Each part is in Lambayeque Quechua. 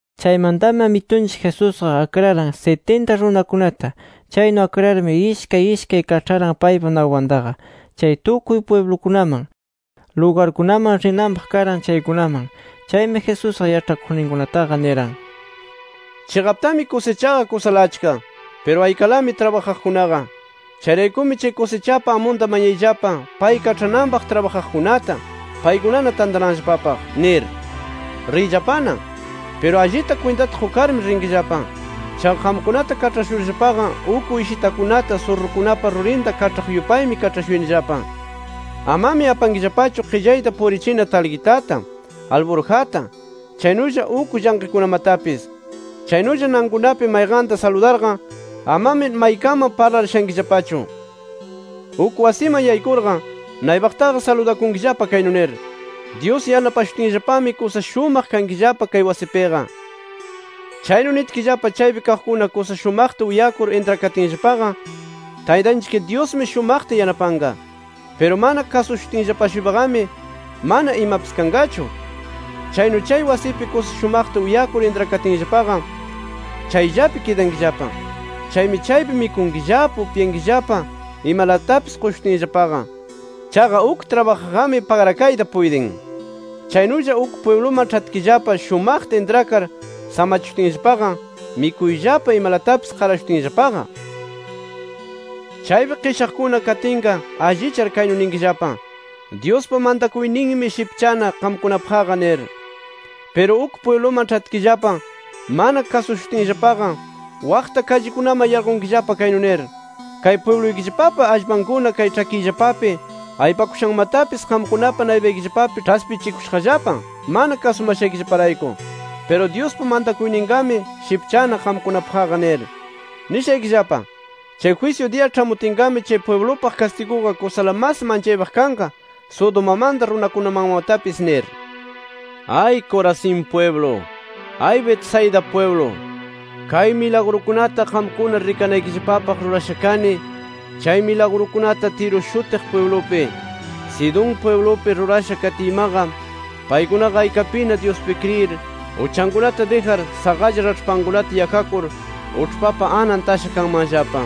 Chaymantami Amitunchik Jesusqa akraran sitinta runakunata. Chaynu akrarmi, ishkay ishkay kaĉharan paypa naypantaqa, chay tukuy pwiblukunaman, lugarkunaman rinanpaq karan chaykunaman. Chaymi Jesusqa yaĉhakuqninkunataqa niran: “Chiqaptami kusichaqa kusala achka. Piru aykalami trabajaqkunaqa. Chayraykumi chay kusichapa amunta mañayllapa, pay kaĉhananpaq trabajaqkunata, paykunana tantananllapapaq nir. Riyllapana. Piru allita kwintata qukarmi rinkillapa. Chaqa qamkunata kaĉhashurllapaqa uk uyshitakunata surrukunapa rurinta kaĉhaq yupaymi kaĉhashuyanillapa. “Amami apankillapachu qillayta purichina talqitata, alburjata, chaynulla uk llanqikunamatapis. Chaynulla nankunapi mayqanta saludarqa, amami maykaman parlar shankillapachu. Uk wasiman yaykurqa, naypaqtaqa saludakunkillapa kaynu nir: ‘Dyus yanapashutinllapami kusa shumaq kankillapa kay wasipiqa’. Chaynu nitkillapa, chaypi kaqkuna kusa shumaqta uyakur intrakatinllapaqa, Taytanchik Dyusmi shumaqta yanapanqa. Piru mana kasushutinllapa-shuypaqami mana imapis kanqachu. Chaynu chay wasipi kusa shumaqta uyakur intrakatinllapaqa, chayllapi kidankillapa. Chaymi chaypi mikunkillapa, upyankillapa imalatapis qushutinllapaqa. Chaqa uk trabajaqqami pagrakayta puytin. “Chaynulla uk pwibluman ĉhatkillapa shumaqta intrakar samachishutinllapaqa, mikuyllapa imalatapis qarashutinllapaqa. Chaypi qishaqkuna katinqa, allichar, kaynu ninkillapa: ‘Dyuspa mantakuyninmi, shipchana qamkunapaqqa’ nir. Piru uk pwibluman ĉhatkillapa mana kasushutinllapaqa, waqta kallikunaman yarqunkillapa, kaynu nir: ‘¡Kay pwibluykillapapa allpankuna kay ĉhakiyllapapi aypakushanmatapis qamkunapa naypaykillapapi ĉhaspichikushaqllapa mana kasumashaykillaparayku! Piru Dyuspa mantakuyninqami shipchana qamkunapaqqa’ nir. Nishaykillapa: Chay jwisyu diya ĉhamutinqami chay pwiblupaq kastiguqa kusala mas manchaypaq kanqa, Sodomamanta runakunamanmatapis nir. “¡Ay Corazín pwiblu! ¡Ay Betsaida pwiblu! Kay milagrukunata qamkuna rikanaykillapapaq rurasha kani, chay milagrukunata Tiro shutiq pwiblupi, Sidón pwiblupi rurasha katiymaqa, paykunaqa aykapina Dyuspi kriyir uchankunata dijar, saqalla raĉhpankunata yakakur, uĉhpapa anan tasha kanmanllapa.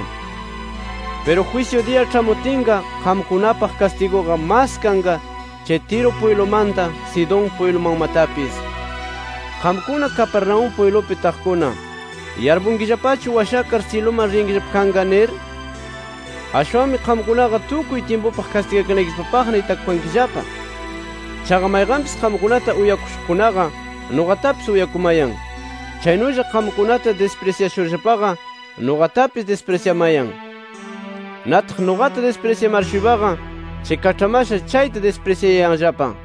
“Piru jwisyu diya ĉhamutinqa, qamkunapaq kastiguqa mas kanqa, chay Tiro pwiblumanta, Sidón pwiblumanmatapis. Qamkuna Capernaúm pwiblupi taqkuna, ¿yarpunkillapachu washakar syiluman riyankillapa kanqa? nir. Ashwanmi qamkunaqa tukuy tyimpupaq kastigakanaykillapapaqna itakukankillapa. “Chaqa mayqanpis qamkunata uyakushuqkunaqa, nuqatapis uyakumayan. Chaynulla qamkunata disprisyashurllapaqa, nuqatapis disprisyamayan. Nataq nuqata disprisyamar-shuypaqa chay kaĉhamasha chayta disprisyayanllapa”.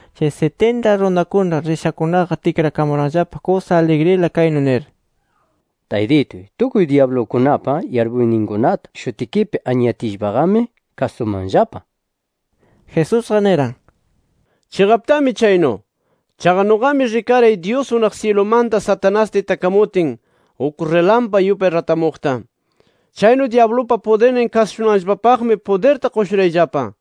Chay sitinta runakuna rishakunaqa, tikrakamuranllapa kusa aligrila, kaynu nir: —¡Taytituy, tukuy dyablukunapa yarpuyninkunata qampa shutikipi anyatiyllapaqami kasumanllapa! nir. Jesusqa niran: —Chiqaptami chaynu. Chaqa nuqami rikaray Dyus unaq syilumanta Satanasta itakamutin, uk rilampa yupay ratamuqta. Chaynu dyablupa pudirnin kasushunanllapapaqmi pudirta qushurayllapa.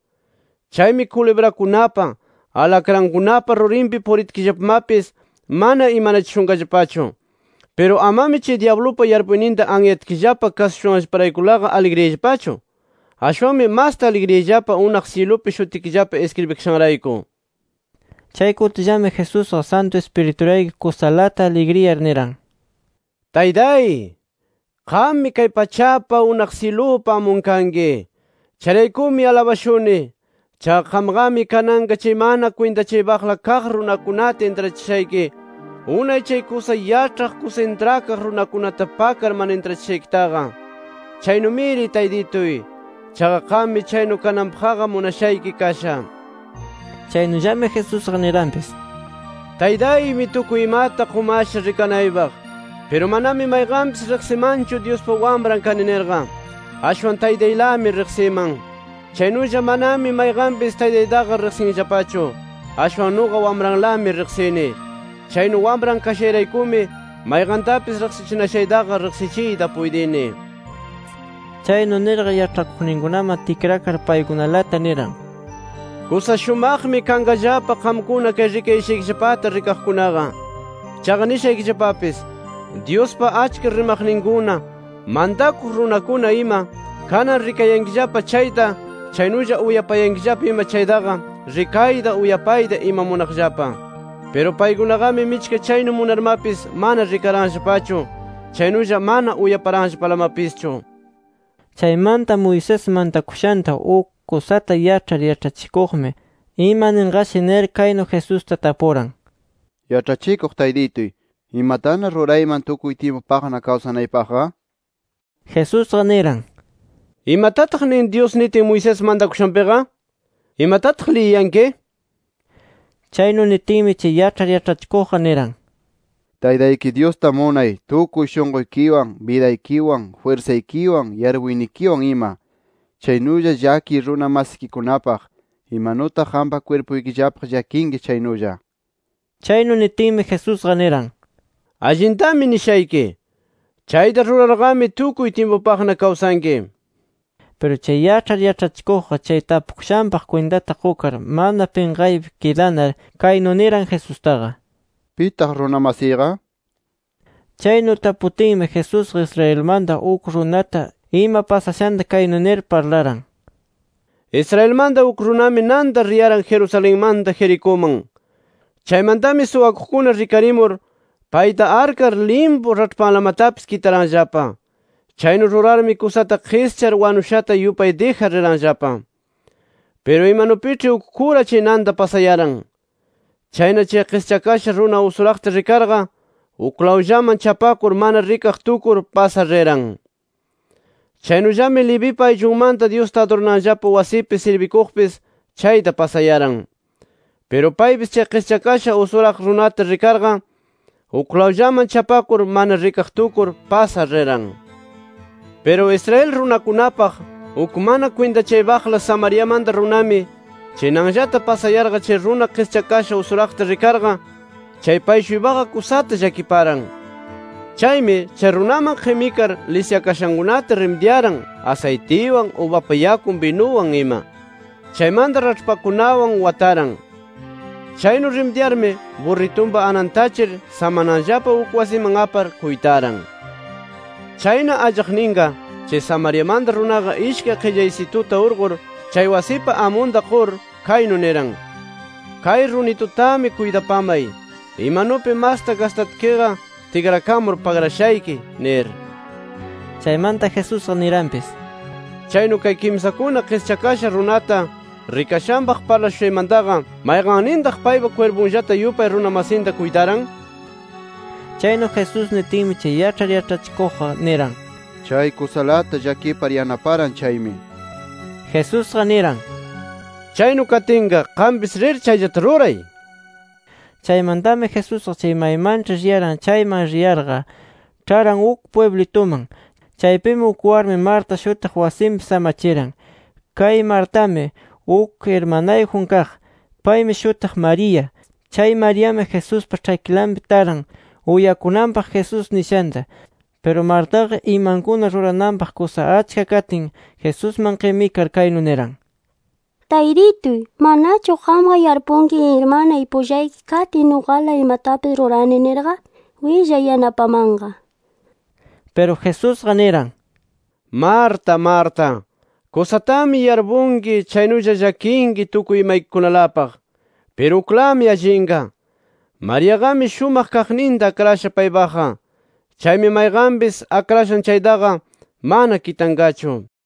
Chaymi kulibrakunapa, alakrankunapa rurinpi puritkillapamapis mana imanachishunqallapachu. Piru amami chay dyablupa yarpuyninta anyatkillapa kasushushanllaparaykulaqa aligriyayllapachu. Ashwanmi masta aligriyayllapa unaq syilupi shutikillapa iskribikashanrayku. Chay kutillami, Jesusqa Santu Ispiriturayku kusalata aligriyar niran: “¡Taytay! Qammi kay pachapa, unaq syilupa amun kanki. Chayraykumi alabashuni. Chaqa qamqami kananqa chay mana kwintachaypaqla kaq runakunata intrachishayki unay chay kusa yaĉhaq, kusa intrakaq runakunata pakar mana intrachishaykitaqa. Chaynumiri Taytituy. Chaqa qammi chaynu kananpaqqa munashayki kasha” nir. Chaynullami Jesusqa niranpis: “Taytaymi tukuy imata qumasha rikanaypaq. Piru manami mayqanpis riqsimanchu Dyuspa Wamran kani nirqa. Ashwan Taytaylami riqsiman. Chaynulla manami mayqanpis Taytaytaqa riqsinllapachu. Ashwan nuqa Wamranlami riqsini. Chaynu Wamran kashayraykumi mayqantapis riqsichinashaytaqa riqsichiyta puytini”. Chaynu nirqa, yaĉhakuqninkunaman tikrakar paykunalata niran: “Kusa shumaqmi kanqallapa, qamkuna kay rikayashaykillapata rikaqkunaqa. Chaqa nishaykillapapis: Dyuspa achka rimaqninkuna, mantakuq runakuna ima, kanan rikayankillapa chayta, chaynulla uyapayankillapa ima chaytaqa, rikayta uyapayta ima munaqllapa. Piru paykunaqami michka chaynu munarmapis mana rikaranllapachu chaynulla mana uyaparanllapalamapischu” nir. Chaymanta Moisés mantakushanta uk kusata yaĉhar yaĉhachikuqmi, ima ninqashi nir, kaynu Jesusta tapuran: —Yaĉhachikuq Taytituy, ¿imatana rurayman tukuy tyimpupaqna kawsanaypaqqa? nir. Jesusqa niran: —¿Imatataq nin Dyus nitin Moisés mantakushanpiqa? ¿Imatataq liyiyanki? Chaynu nitinmi chay yaĉhar yaĉhachikuqqa niran: —Taytayki Dyusta munay tukuy shunquykiwan, bidaykiwan, jwirsaykiwan, yarpuynikiwan ima. Chaynulla llakiy runa masikikunapaq, imanutaq qampa kwirpuykillapaq llakinki chaynulla nir. Chaynu nitinmi Jesusqa niran: —Allintami nishayki. Chayta rurarqami, tukuy tyimpupaqna kawsanki nir. Piru chay yaĉhar yaĉhachikuqqa, chay tapukushanpaq kwintata qukar mana pinqaypi kidanar kaynu niran Jesustaqa: —¿Pitaq runa masiyqa? Chaynu taputinmi, Jesusqa Israelmanta uk runata ima pasashanta kaynu nir parlaran: “Israelmanta uk runami nanta riyaran Jerusalenmanta Jericuman. Chaymantami suwakuqkuna rikarimur payta arkar limpu raĉhpanlamatapis kitaranllapa. Chaynu rurarmi kusata qischar, wanushata yupay dijar riranllapa. “Piru imanupiĉhi uk kura chay nanta pasayaran. Chayna chay qischakasha runa usuraqta rikarqa, uklawllaman chapakur mana rikaq tukur, pasar riran. Chaynullami levipa ayllunmanta Dyusta adurananllapa wasipi sirbikuqpis, chayta pasayaran. Piru paypis chay qischakasha usuraq runata rikarqa, uklawllaman chapakur mana rikaq tukur, pasar riran. “Piru Israel runakunapaq uk mana kwintachaypaqla Samariamanta runami, chay nanllata pasayarqa chay runa qischakasha usuraqta rikarqa, chay pay-shuypaqa kusata llakiparan. Chaymi, chay runaman qimikar, lisyakashankunata rimidyaran asaytiwan, ubapa yakun binuwan ima. Chaymanta raĉhpakunawan wataran. Chaynu rimidyarmi, burritunpa anan tachir samananllapa uk wasiman apar kuytaran. “Chayna allaqninqa, chay Samariamanta runaqa ishkay qillaysituta urqur chay wasipa amunta qur, kaynu niran: ‘Kay runitutami kuytapamay. Imanupi masta gastatkiqa tikrakamur pagrashayki’ nir”. Chaymanta Jesusqa niranpis: —Chaynu kay kimsakuna qischakasha runata rikashanpaq parlashushaymantaqa, ¿mayqannintaq paypa kwirpunllata yupay runa masinta kuytaran? Chaynu Jesús nitinmi, chay yaĉhar yaĉhachikuqqa niran: —Chay kusalata llakipar yanaparan chaymi, nir. Jesusqa niran: —Chaynu katinqa qampis rir chayllata ruray nir. Chaymantami Jesusqa chay maymanĉhi riyaran chayman riyarqa, ĉharan uk pwiblituman. Chaypimi, uk warmi Marta shutiq, wasinpi samachiran. Kay Martami uk irmanayjun kaq. Paymi shutiq María. Chay Mariami Jesuspa ĉhakilanpi taran uyakunanpaq Jesús nishanta. Piru Martaqa, imankuna rurananpaq kusa achka katin Jesusman qimikar kaynu niran: —Taytituy, ¿manachu qamqa yarpunki irmanay pullayki katin nuqala imatapis rurani nirqa? Willay yanapamanqa nir. Piru Jesusqa, niran: —Marta, Marta, kusatami yarpunki, chaynulla llakinki tukuy imaykikunalapaq. Piru uklami allinqa; Mariaqami shumaq kaqninta akrasha paypaqqa. Chaymi mayqanpis akrashan chaytaqa mana kitanqachu nir.